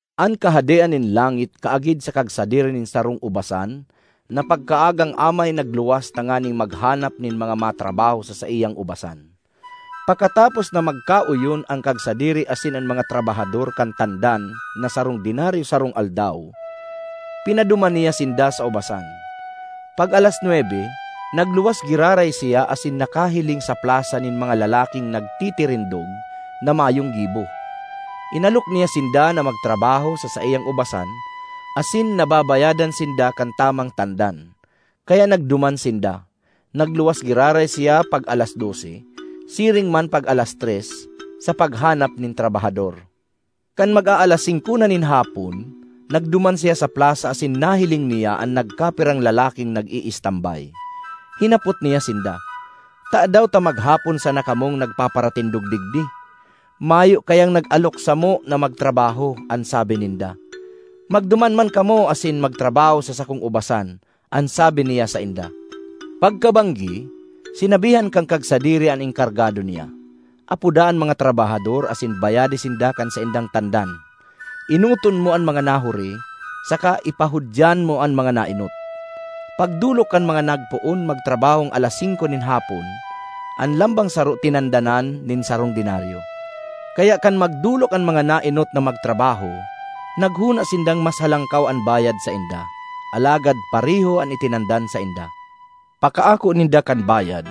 ”An Kahadean nin langit kaagid sa kagsadiri nin sarong ubasan na pagkaagang amay nagluwas tanganing maghanap nin mga matrabaho sa saiyang ubasan. Pakatapos na magkaoyon an kagsadiri asin an mga trabahador kan tandan na sarong denaryo sarong aldaw, pinaduman niya sinda sa ubasan. Pag-alas nwebe, nagluwas giraray siya asin nakahiling sa plasa nin mga lalaking nagtitirindog na mayong gibo. Inalok niya sinda na magtrabaho sa saiyang ubasan asin na babayadan sinda kan tamang tandan. Kaya nagduman sinda. Nagluwas giraray siya pag-alas dose, siring man pag-alas tres, sa paghanap nin trabahador. Kan mag-aalas singko na nin hapon, nagduman siya sa plasa asin nahiling niya an nagkapirang lalaking nag-iistambay. Hinapot niya sinda, ‘Tadaw ta maghapon sana kamong nagpaparatindog digdi?’ ‘Mayo kayang nag-alok samo na magtrabaho,’ an sabi ninda. ‘Magduman man kamo asin magtrabaho sa sakong ubasan,’ an sabi niya sainda. ”Pagkabanggi, sinabihan kan kagsadiri an enkargado niya, ‘Apoda an mga trabahador asin bayade sinda kan saindang tandan. Enoton mo an mga nahuri, saka ipahudyan mo an mga naenot.’ Pagdolok kan mga nagpoon magtrabahong alas singko nin hapon, an lambang saro tinandanan nin sarong denaryo. Kaya kan magdolok an mga naenot na magtrabaho, naghona sindang mas halangkaw an bayad sainda; alagad pareho an itinandan sainda. Pakaako ninda kan bayad,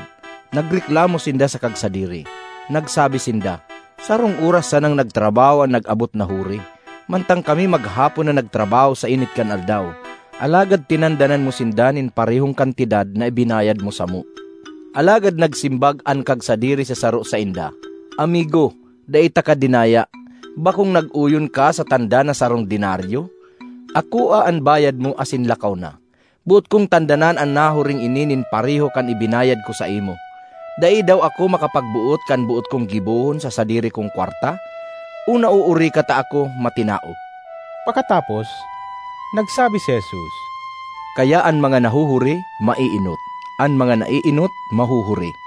nagreklamo sinda sa kagsadiri. Nagsabi sinda, ‘Sarong oras sanang nagtrabaho an nag-abot na huri, mantang kami maghapon na nagtrabaho sa init kan aldaw, alagad tinandanan mo sinda nin parehong kantidad na ibinayad mo samo.’ Alagad nagsimbag an kagsadiri sa saro sainda, ‘Amigo, dai taka dinaya. Bakong nag-oyon ka sa tandan na sarong denaryo? Akoa an bayad mo asin lakaw na. Boot kong tandanan an nahuring ini nin pareho kan ibinayad ko saimo. Dai daw ako makapagboot kan boot kong gibohon sa sadiri kong kwarta? O naoori ka ta ako matinao?’” Pakatapos, nagsabi si Jesus, “Kaya an mga nahuhuri, maeenot; an mga naeenot, mahuhuri.”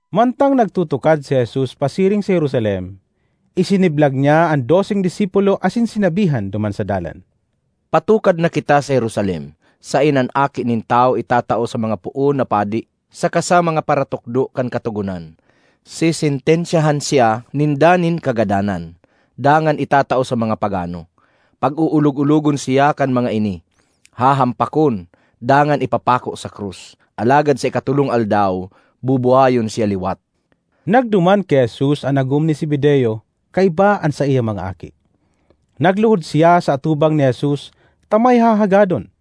Mantang nagtutukad si Jesus pasiring sa Jerusalem, isiniblag niya an doseng disipulo asin sinabihan duman sa dalan, ”Patukad na kita sa Jerusalem saen an Aki nin Tawo itatao sa mga poon na padi saka sa mga paratukdo kan Katogonan. Sesentensyahan siya ninda nin kagadanan dangan itatao sa mga pagano. Pag-oolog-ologon siya kan mga ini, hahampakon, dangan ipapako sa krus; alagad sa ikatolong aldaw bubuhayon siya liwat.” Nagduman ki Jesus an agom ni Zebedeo kaiba an saiyang mga aki. Nagluhod siya sa atubang ni Jesus ta may hahagadon.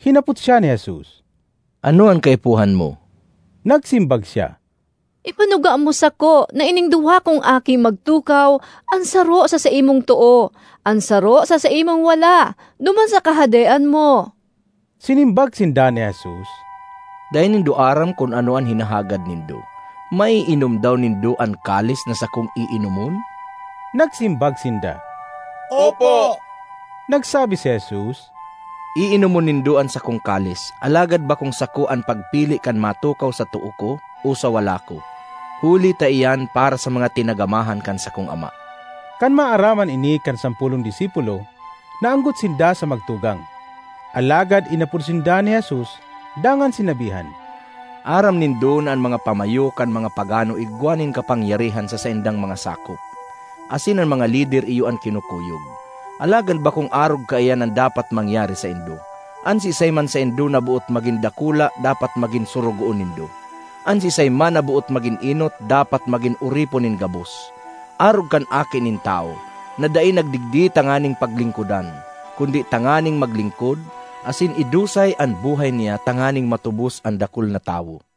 Hinapot siya ni Jesus, “Ano an kaipuhan mo?” Nagsimbag siya, “Ipanuga mo sako na ining duwa kong aki magtukaw, an saro sa saimong too, an saro sa saimong wala duman sa Kahadean mo.” Sinimbag sinda ni Jesus, “Dai nindo aram kun ano an hinahagad nindo. Maiinom daw nindo an kalis na sakong iinomon?” Nagsimbag sinda, “Opo.” Nagsabi si Jesus, “Iinomon nindo an sakong kalis, alagad bakong sako an pagpili kan matukaw sa too ko o sa wala ko, huli ta iyan para sa mga tinagamahan kan sakong Ama.” Kan maaraman ini kan sampolong disipulo, naanggot sinda sa magtugang. Alagad inapod sinda ni Jesus dangan sinabihan, “Aram nindo na an mga pamayo kan mga pagano igwa nin kapangyarihan sa saindang mga sakop, asin an mga lider iyo an kinukuyog. Alagad bakong arog kaiyan an dapat mangyari saindo. An siisay man saindo na boot magin dakula dapat magin sorogoon nindo. An siisay man na boot magin enot, dapat magin oripon nin gabos; arog kan Aki nin Tawo, na dai nagdigdi tanganing paglingkodan kundi tanganing maglingkod, asin idusay an buhay niya tanganing matubos an dakul na tawo.”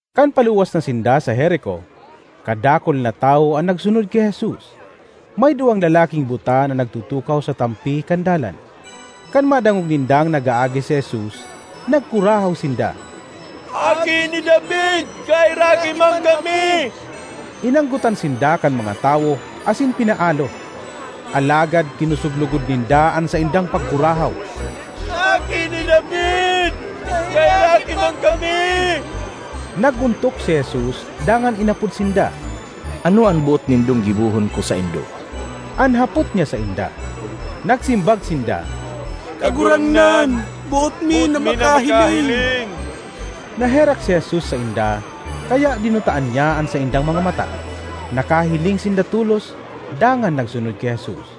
Kan paluwas na sinda sa Jerico, kadakul na tawo an nagsunod ki Jesus. May duwang lalaking buta na nagtutukaw sa tampi kan dalan. Kan madangog nindang nag-aagi si Jesus, nagkurahaw sinda, “Aki ni David! Kaheraki man kami!” Inanggotan sinda kan mga tawo asin pinaalo. Alagad kinosog logod ninda an saindang pagkurahaw, “Aki ni David! Kaheraki man kami!” Nag-ontok si Jesus dangan inapod sinda. “Ano an boot nindong gibohon ko saindo?” an hapot niya sainda. Nagsimbag sinda, “Kagurangnan, boot mi na makahiling!” Naherak si Jesus sainda kaya dinutaan niya an saindang mga mata; nakahiling sinda tolos dangan nagsunod ki Jesus.